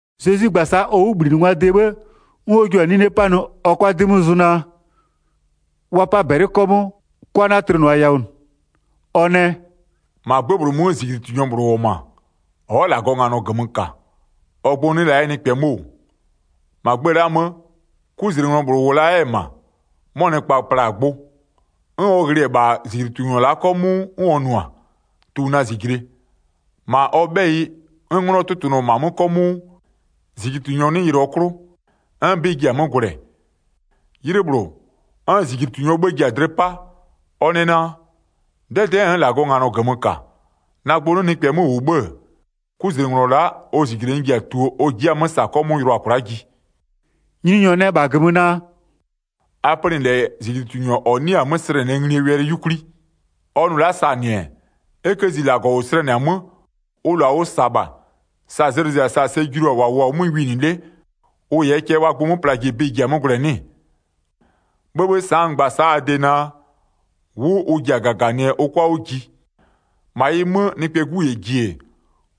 Zezwi gba-a sa'a ɔ 'wʋbhlinɩngwaa de 'bhë, 'n ɔ jua-a 'nine 'panɩ ɔ 'kʋa 'dɩ 'mö zʋ naa: Wa 'pa -bɛlɩ 'kɔmʋʋ, 'kwa 'na-a tlɩnʋa yawʋ -nɩ. Ɔ nɛ: “-Ma 'gbë -bhlʋ 'mö -zijlitunyɔ -bhlʋ -wʋ-ɔ -ma, ɔ'ɔ -Lagɔɔ nganɔ -gömö -ka, ɔ gbʋ 'nɩ la 'yɛ nɩkpɛ 'mö -wʋ. 3-Ma gbë la'aa 'mö, 'kuzlenglɔ -bhlʋ -wʋ la 'yɛ-ɛ -ma, 'mɔ nɩkpa pla-a gbʋ. 'N ɔ ghlɩ-ɛ -bha -zijlitunyɔ la'a 'kɔmʋʋ, 'n ɔ nʋ-a: Tu na -zijle. 4-Ma ɔ 'bhɛyɩ, 'n 'nglɔ 'tʋtʋnʋ-ɔ -ma 'mö 'kɔmʋʋ, -zijlitunyɔ 'nɩ yɩlɩɔ 'klʋ, 'n 'bɩ ji-a 'mö gwlɛ. 'Ylɩ -bhlʋ, 'n -zijlitunyɔɔ 'bhë ji-a dlɩ 'pa, ɔ nɛ naa: 'Dɛdɛ'ɛ n'n -Lagɔɔ nganɔ -gömö -ka, na gbʋ 'nɩ nɩkpɛ 'mö -wʋ 'bhë-ë, 'kuzlenglɔ la'a, ɔ -zijle n ji-a tuo ɔ ji'i-a 'mö -sa 'kɔmʋʋ yʋlʋa kwla'a ji.” Nyininyɔ nɛ -bha -gömö naa: “A pönɩ -lɛ -zijlitunyɔ -ɔ 'nɩ-a 'mö slɛnɩɛ nglie wɛlɩ 'yukwli. Ɔ nʋ la'a -sa-a -nɩ-ɛ, e 'kë zi -Lagɔ -ʋ slɛnɩ-a 'mö, ʋ -lʋa ʋ -sa-a -bha, sa zlɩ zɩ-a sa sɛ julu-a -wa -wʋʋ-a 'mö winɩ 'le, ʋ -yɛɛ cɛ wa gbʋ 'mö plaa ji bɩ-ɩ ji-a 'mö gwlɛɛ 'nɩ-ɩ? 'Bhëbhë, sa'a n gba-a sa'a a de naa: 'Wʋ ʋ ji-a -gaganɩɛ ʋ 'kʋa 'wʋ ji. -Ma ɩ 'mö, Nɩkpɛɛ 'Gu -yɛ ji-e,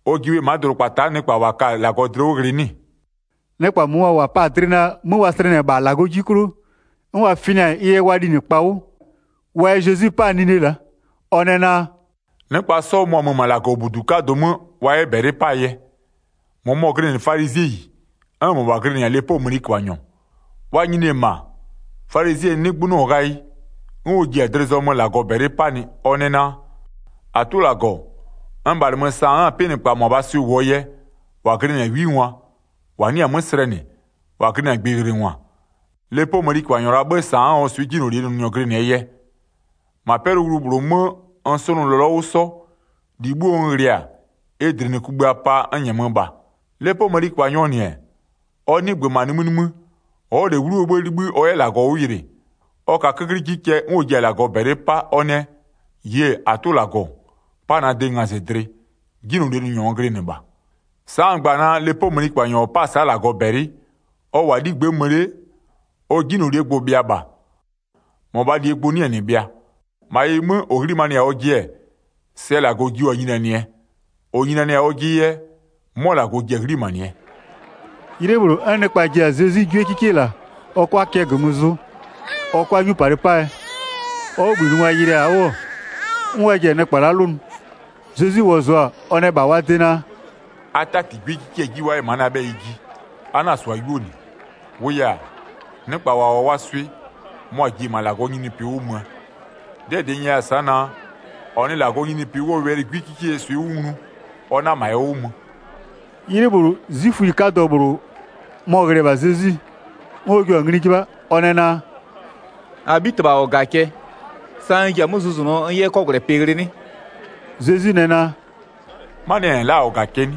ɔ ji bhe ma'a dʋdʋkpata'a nɩkpa -wa ka-a -Lagɔ dlɩ 'wʋ ghlɩ 'nɩ-ɩ?” Nɩkpa -mʋmʋa -wa pa-a dlɩ naa, 'mö wa slɛnɩ-ɛ -bha -Lagɔɔ 'ji 'klʋ, 'n wa fɩna-a ɩ yɛ wa linɩkpa 'wʋ wa yɛ Zezwi 'pa-a nine la'a, ɔ nɛ naa: “Nɩkpa 'sɔ mʋa-a mö-ö -ma -Lagɔbudu 'kadʋ 'mö wa 'yɛ -bɛlɩ 'paa yɛ. -Mʋmɔ glɩnɩ falizɩɛyi, 'n -mɔbha glɩnɩ-a lepoo mëniköbhanyɔ. Wa nyini-e -ma, falizɩɛyi 'nɩgbönɩɔ ghayɩ, 'n ɔ ji-a dlɩ zɔmö -Lagɔ -bɛlɩ 'panɩ, ɔ nɛ naa: -Atʋ -Lagɔ, n -bhalɩmö, sa n'n-a 'pɩnɩkpa -mʋabhaa swɩ -wʋɔ yɛ, -wa glɩnɩ-a 'wingwa, -wa 'nɩ-a 'mö slɛnɩ, -wa glɩnɩ-a gbɩyɩlɩngwa, lepoo mëniköbhanyɔ -laa 'bhë sa n'n-a ɔ swɩ 'jinylolie nʋnyɔ glɩnɩɛ yɛ. 12-Ma 'pɛlʋwlu -bhlʋ 'mö n 'sʋnʋ lɔlɔ 'wʋ 'sɔ, -li 'bhuo n ghlɩ-a, ɩ -dlinɩkugbïa pa n -nyɛmö -bha. Lepoo mëniköbhanyɔɔ -nɩ-ɛ, ɔ 'nɩgbö -ma nimï nimï, ɔ'ɔ -lɛ 'wluo 'bhë 'libhï ɔ 'yɛ -Lagɔ 'wʋ yɩlɩ, ɔ ka 'köklɩ 'ji cɛ 'n ɔ ji-a -Lagɔ -bɛlɩ 'pa, ɔ nɛ: -Yie! -Atʋ -Lagɔ, 'pa na de ngazɩdlɩ, 'jinylolie nʋnyɔ n glɩnɩ -bha. Sa'a n gba-a naa, lepoo mëniköbhanyɔ -ɔ 'pa-a sa'a -Lagɔ -bɛlɩ, ɔ -wʋ-a 'ligbë'ë mö 'le, ɔ 'jinylolie gbʋ-ʋ bhɩa -bha, -mɔbhaa -lie gbʋ 'nɩ-ɛ -nɩ bhɩa. -Ma ɩ 'mö, -ɔ 'ghlimanɩ-a ɔjɩ-ɛ, sɛ -Lagɔ jio-a nyinianɩɛ, -ɔ nyinianɩ-a ɔjɩ yɛ, 'mɔ -Lagɔ ji-a 'ghlimanɩɛ.” 'Ylɩ -bhlʋ, 'n nɩkpa ji-a Zezwi 'gwiekikie -la, ɔ 'kʋa cɛ -gömö zʋ ɔ 'kʋa 'nyupalɩ 'paa yɛ. Ɔ 'wʋbhlinɩngwa yɩlɩɩ-a 'wʋ 'n wa ji-a nɩkpa la'a 'lʋnʋ. Zezwi wɔzʋa-a, ɔ nɛ -bha wa de naa: “A 'tati 'gwiekikie 'ji wa 'yɛ ma'a na 'bhɛyɩ ji. A 'na-a -sʋa 'yuo -nɩ. -Wʋʋ yɛ-a, nɩkpa -wa -wʋ-a wa swɩ, mʋa-a ji-e -ma -Lagɔɔ nyininyinipɩ 'wʋ möö. 'Dɩɛ -dɩ n 'nyɛya-a sa'a naa: -Ɔ nɩ -Lagɔɔ nyininyinipɩ 'wʋɔ wɛlɩ 'gwikikeyie swɩ 'wʋ nglu ɔ 'na -ma ɛ 'wʋ mö.” 'Ylɩ -bhlʋ, 'zwiföyi 'kadɔ -bhlʋ, mɔ-ɔ ghlɩ-ɛ -bha Zezwi, 'n ɔ jio-a ngli 'jɩbha, ɔ nɛ naa: “-Abhitɩbha -ɔ -ga cɛ, sa n ji-a 'mö zʋzʋnʋɔ n 'yɛ 'kɔgwlɛpɩ ghlɩ 'nɩ?” Zezwi nɛ naa: “Manɩɛ yɛ -n la'a-a -ɔ -ga cɛ 'nɩ?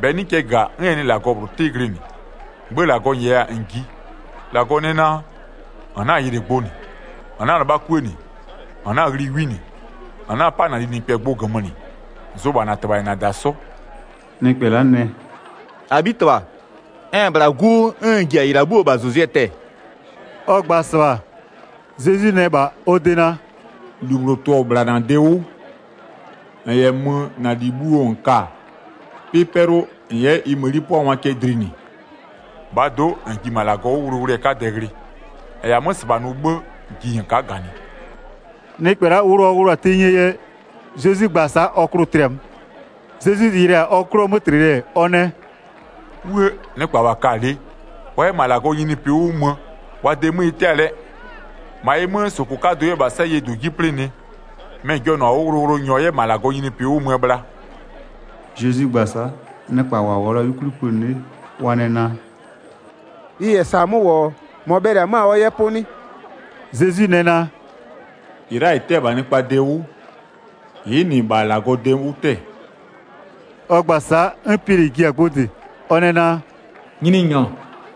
-Bɛ 'nɩ cɛ -ga, 'n ɛ nɩ -Lagɔ -bhlʋ 'tɩ glɩnɩ. Gbö -Lagɔ -nyɛya-a -n jiɩ. -Lagɔ nɛ naa: -N 'na-a yɩlɩ gbʋ -nɩ, -n 'na-a 'lɩbha 'kuë -nɩ, -n 'na-a ghli 'wi -nɩ, -n 'na-a 'pa -na linɩkpɛ gbʋ -gömö -nɩ, zʋ -bha -na -tɩbha -yɛ -na -da 'sɔ.” Nɩkpɛ la'a nɛ: “-Abhitɩbha, n-n -bhla 'gu 'wʋ, 'n n ji-a -ɩ -la 'bhuoo -bhazʋzʋɛ tɛ-ɛ.” Ɔ gba-a -sɩbha, Zezwi nɛ -bha ɔ de naa: “-Lu -bhlʋ tʋ-ɔ -bhla -na de 'wʋ. -N -yɛ mö -na -li bhuoo -n -ka-a, 'pɩ 'pɛlʋ -n 'yɛ ɩ mëni 'pʋangwa cɛ dlinɩ. -Bhaa do'o, -n ji -ma -Lagɔ 'wʋ wʋlʋwʋlʋɛ 'kadɛ ghlɩ. -N -yɛ-a 'mö -sɩbha nʋ 'bhë, ji -n ka'a -ganɩ.” Nɩkpɛ la'a, wʋlʋ ɔ wʋlʋ-a tenyie yɛ, Zezwi gba-a sa'a ɔ klʋ-ʋ tlɩ-a 'mö. Zezwi yɩlɩ-a ɔ 'klʋɔ 'mötlɩlɩ-ɛ, ɔ nɛ: “'Wuë! Nɩkpa -wa ka-a lɩ wa 'yɛ -ma -Lagɔɔ nyininyinipɩ 'wʋ mö, wa de 'mö ɩ 'tɛ-a lɛɛ! 25-Ma ɩ 'mö, -sʋkʋ 'kadʋ 'yɛ -bha 'sayie -dʋ 'ji 'plɩnɩ, mɩ-ɩ jɔnʋ-a 'wʋ wʋlʋwʋlʋnyɔ 'yɛ -ma -Lagɔɔ nyininyinipɩ 'wʋ möö bhla.” Zezwi gba-a sa'a, nɩkpa -wa -wʋɔ la-a 'yukwli pönɩ 'le, wa nɛ naa: “Ɩ -yɛ -sa 'mö -wʋ-ɔ, -mɔ bhɛlɩ-ɛ 'mö-a ɔ 'yɛ 'pʋ 'nɩ?” Zezwi nɛ naa: “-Ɩ la'a -ɩ 'tɛ-ɛ -bha nɩkpaa de 'wʋ, ɩ'ɩ -nɩ -bha -Lagɔɔ de 'wʋ 'tɛ-ɛ.” Ɔ gba-a sa'a 'n Piɛlɩ ji-a gbʋ -dɩ, ɔ nɛ naa: “Nyininyɔ,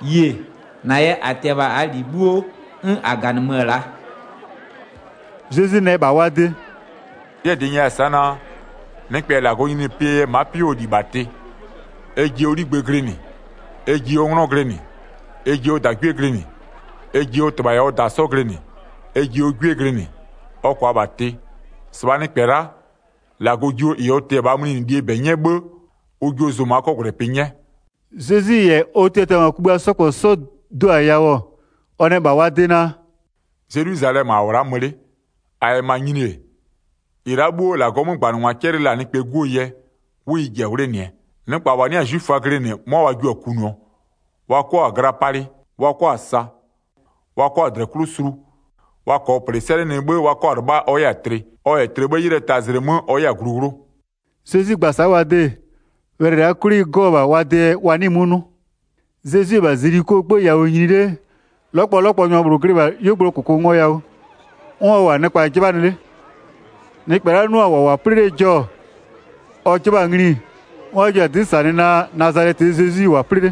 yie, -na yɛ -a tɩ-ɛ -bha -aa -li 'bhuo 'n -a -ganɩmö-ö la'a.” Zezwi nɛ -bha wa de: “'Dɩɛ -dɩ n 'nyɛya-a sa'a naa: Nɩkpɛ -yɛ -Lagɔɔ nyininyinipɩɛ yɛ ma'a 'pɩ 'wʋɔ -li -bha tɩ, ɛ ji 'ligbë glɩnɩ, ɛ ji ɔ 'nglɔ glɩnɩ, ɛ ji ɔ -dagwie glɩnɩ, ɛ ji ɔ -tɩbha -yɛ ɔ -da 'sɔ glɩnɩ, ɛ ji ɔ 'gwie glɩnɩ, ɔ -kʋa -bha tɩ, 30-sɩbhaa nɩkpɛ la'a, -Lagɔ jio -ɩ ɔ tɩ-ɛ -bhaa mlinɩlie -bɛ 'nyɛ 'bhë, ʋ jio 'yɛ zʋma 'kɔgwlɛpɩ 'nyɛ.” Zezwi -yɛ ɔ tiatiangwa kugbïa 'sɔ -kpɔ 'sɔ do-a yawʋ, ɔ nɛ -bha wa de naa: “Zelwizalɛmö -a -wʋ-ɔ la'a mö 'le. -A -yɛ -ma nyini-e, -ɩ la'a 'bhuo -Lagɔɔ 'mögbanɩngwa 'cɛlɩ la-a Nɩkpɛɛ 'Guo yɛ, 'wʋ ɩ ji-a 'wlenɩɛ. Nɩkpa -wa 'nɩ-a 'zwiföa glɩnɩ 'mʋa wa jio-a kunʋɔ, wa 'kɔ-a gla palɩ, wa 'kɔ-a sa, wa 'kɔ-a -dlɛ 'wʋ sulu. Wa -kɔɔ -plɩ 'sɛlɩnɩ 'bhë, wa 'kɔ-a 'lɩbha ɔ 'yɛ-a tlɩ. Ɔ -yɛ tlɩ 'bhë 'ylɩɛ tazlɩ 'mö ɔ 'yɛ-a glu 'wlʋ.” Zezwi gba-a sa'a wa de-e, wɛlɩ la'a 'klʋ ɩ 'gɔ-ɔ -bha wa dee yɛ, wa 'nɩɩ-ɩ 'mö 'nʋ. Zezwi-e -bha Zelikoo 'gbë yawʋ nyini 'le, 'lɔkpɔlɔkpɔnyɔ -bhlʋ glɩ -bha 'yuogblʋɔ -kʋkʋngoyawʋ, 'n ɔ -wʋ-a nɩkpa 'jɩbhanɩ 'le. Nɩkpɛ la'a 'nʋ-a -wa -wʋ-a 'plɩ 'lee jɔ-ɔ, ɔ 'jɩbha-a ngli, 'n wa jio-a 'dɩ -sanɩ naa Nazalɛtɩɛ Zezwi -wʋ-a 'plɩ 'le.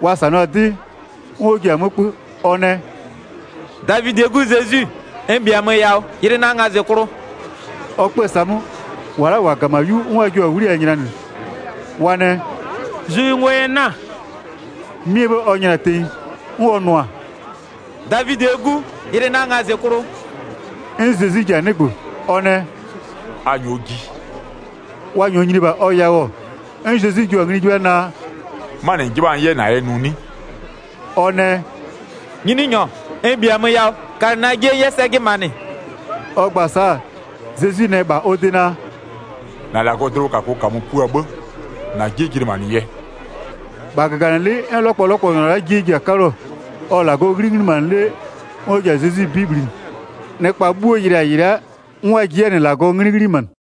Wa -sanɩɔ-a 'dɩ, 'n ɔ ji-a 'mö 'kpö, ɔ nɛ: “Davidɩɛ 'Gu Zezwi, n -bhiamö yawʋ yɩlɩ na ngazɩklʋ!” Ɔ 'kpö-ö sa'a 'mö, -wa la'a -wa -ga-a -ma 'yu 'n wa jio-a 'wliyawʋ nylanɩ, wa nɛ: “Zʋ yɩ ngo yɛ 'na-a!” 'Mɩɛ 'bhë ɔ nyla-a tenyi, 'n ɔ nʋ-a: “Davidɩɛ 'Gu Zezwi, yɩlɩ na ngazɩklʋ!” 'N Zezwi ji-a 'nɩgbö, ɔ nɛ: “A -nyɔɔ ji.” Wa -nyɔɔ nyini-e -bha ɔ yawʋ-ɔ, 'n Zezwi jio-a ngli 'jɩbha naa: “'Manɩ -n 'jɩbha-a n 'yɛ -na de nʋ 'nɩ?” Ɔ nɛ: “Nyininyɔ, n -bhiamö yawʋ kalɩ na 'jie n 'yɛ sɛ jɩnɩmanɩ.” Ɔ gba-a sa'a, Zezwi nɛ -bha ɔ de naa: “-Na -Lagɔɔ dlɩwʋkakʋ -kamö pua 'bhë, -na 'jie jɩnɩmanɩ yɛ.” 43-Bha -gaganɩlɩ'ɩ, 'n 'lɔkpɔlɔkpɔnyɔ 'jie ji-a 'kaluo. Ɔ-ɔ -Lagɔɔ 'nglɩ 'ghlimanɩ 'le 'n ɔ ji-a Zezwi 'bɩ bhlinɩ. Nɩkpa 'bhuo yɩlɩ-a -ɩ la'a, 'n wa ji 'yɛ-a -nɩ -Lagɔɔ 'nglɩ 'ghlimanɩ.